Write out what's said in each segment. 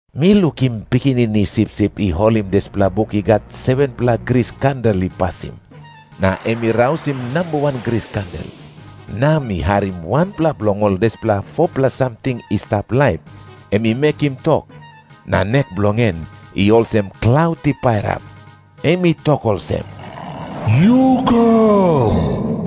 Mi lukim Pikinini Sipsip i holim dispela buk i gat 7-pela gris kandel i pasim, na em i rausim namba wan gris kandel. Na mi harim wanpela bilong ol dispela 4-pela samting i stap laip em i mekim tok, na nek bilong en i olsem klaut i pairap. Em i tok olsem, "Yu kam."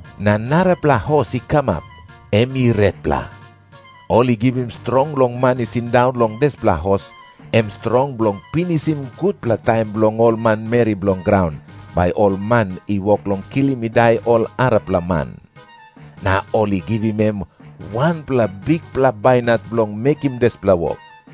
Na narapela hos i kamap, em i retpela. Ol i givim strong long man i sindaun long dispela hos, em strong bilong pinisim gutpela taim bilong ol manmeri bilong graun, bai ol man i wok long kilim i dai ol arapela man. Na ol i givim em wanpela bikpela bainat bilong mekim dispela wok.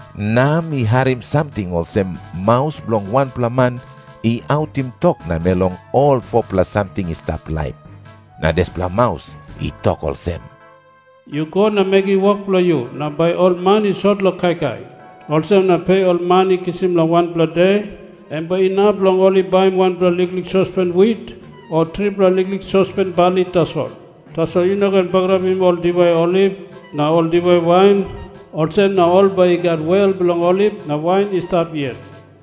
Na mi harim samting olsem maus bilong wanpela man i autim tok namel long ol 4-pela samting i stap laip, na dispela maus i tok olsem, "Yu go na mekim wok bilong yu, na bai ol man i sot long kaikai. Olsem na pe ol man i kisim long wanpela de, em bai inap long ol i baim wanpela liklik sospen wit o tripela liklik sospen bali tasol. Tasol yu no ken bagarapim ol diwai oliv na ol diwai wain, olsem na ol bai i gat wel bilong oliv na wain i stap yet."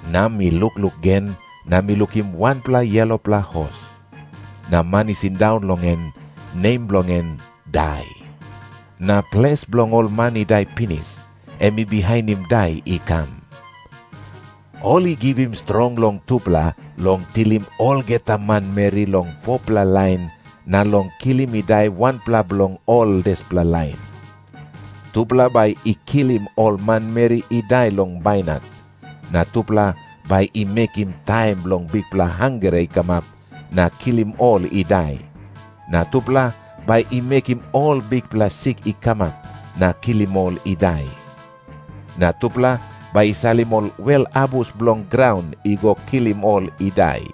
Na mi lukluk gen, na mi lukim wanpela yelopela hos. Na man i sindaun long en, nem bilong en Dai. Na Ples bilong ol man i dai pinis, em i bihainim Dai i kam. Ol i givim strong long tupela long tilim olgeta manmeri long 4-pela lain na long kilim i dai wanpela bilong ol dispela lain. Tupela bai i kilim ol manmeri i dai long bainat, na tupela bai i mekim taim bilong bikpela hangre i kamap na kilim ol i dai, na tupela bai i mekim ol bikpela sik i kamap na kilim ol i dai, na tupela bai i salim ol wel abus bilong graun i go kilim ol i dai.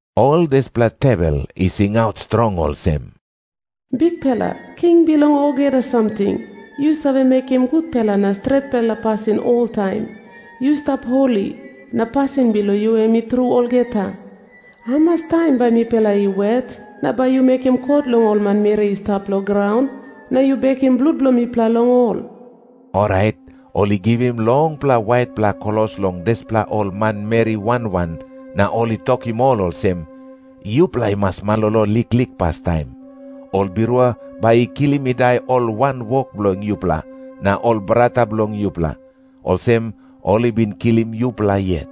Ol dispela tewel i singaut strong olsem, "Bikpela King bilong olgeta samting, yu save mekim gutpela na stretpela pasin oltaim. Yu stap holi, na pasin bilong yu em i tru olgeta. Hamas taim bai mipela i wet, na bai yu mekim kot long ol manmeri i stap long graun, na yu bekim blut bilong mipela long ol?" Orait ol i givim longpela waitpela klos long dispela ol manmeri wan wan, na ol i tokim ol olsem, "Yupela i mas malolo liklik pastaim. Ol birua bai i kilim i dai ol wanwok bilong yupela na ol brata bilong yupela, olsem ol i bin kilim yupela yet.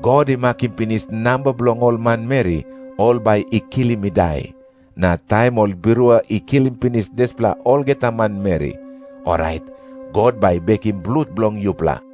God i makim pinis namba bilong ol manmeri ol bai i kilim i dai, na taim ol birua i kilim pinis dispela olgeta manmeri, orait God bai i bekim blut bilong yupela."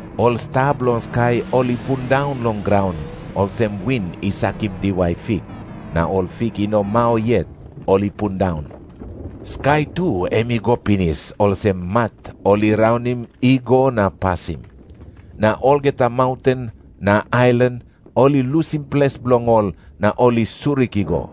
Ol sta bilong skai ol i pundaun long graun, olsem win i sakim diwai fik na ol fik i no mau yet ol i pundaun. Skai tu em i go pinis, olsem mat ol i raunim i go na pasim. Na olgeta maunten na ailan ol i lusim ples bilong ol, na ol i surik i go.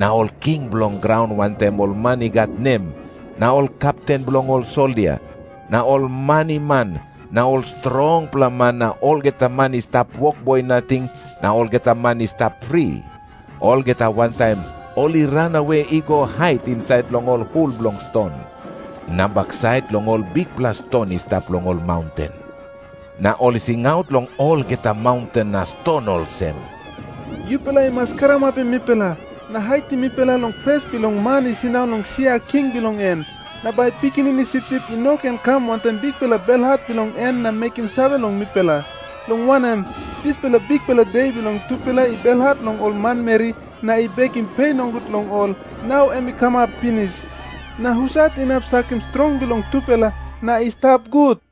Na ol king bilong graun wantaim ol man i gat nem na ol kepten bilong ol soldia na ol maniman na ol strongpela man na olgeta man i stap wokboi nating na olgeta man i stap fri, olgeta wantaim ol i ranawe i go hait insait long ol hul bilong ston na baksait long ol bikpela ston i stap long ol maunten. Na ol i singaut long olgeta maunten na ston olsem, "Yupela i mas karamapim mipela, na haitim mipela long pes bilong Man i sindaun long sia king bilong en, na bai Pikinini Sipsip i no ken kam wantaim bikpela belhat bilong en na mekim save long mipela. Long wanem, dispela bikpela De bilong tupela i belhat long ol manmeri na i bekim pe nogut long ol, nau em i kamap pinis. Na husat inap sakim strong bilong tupela na i stap gut?"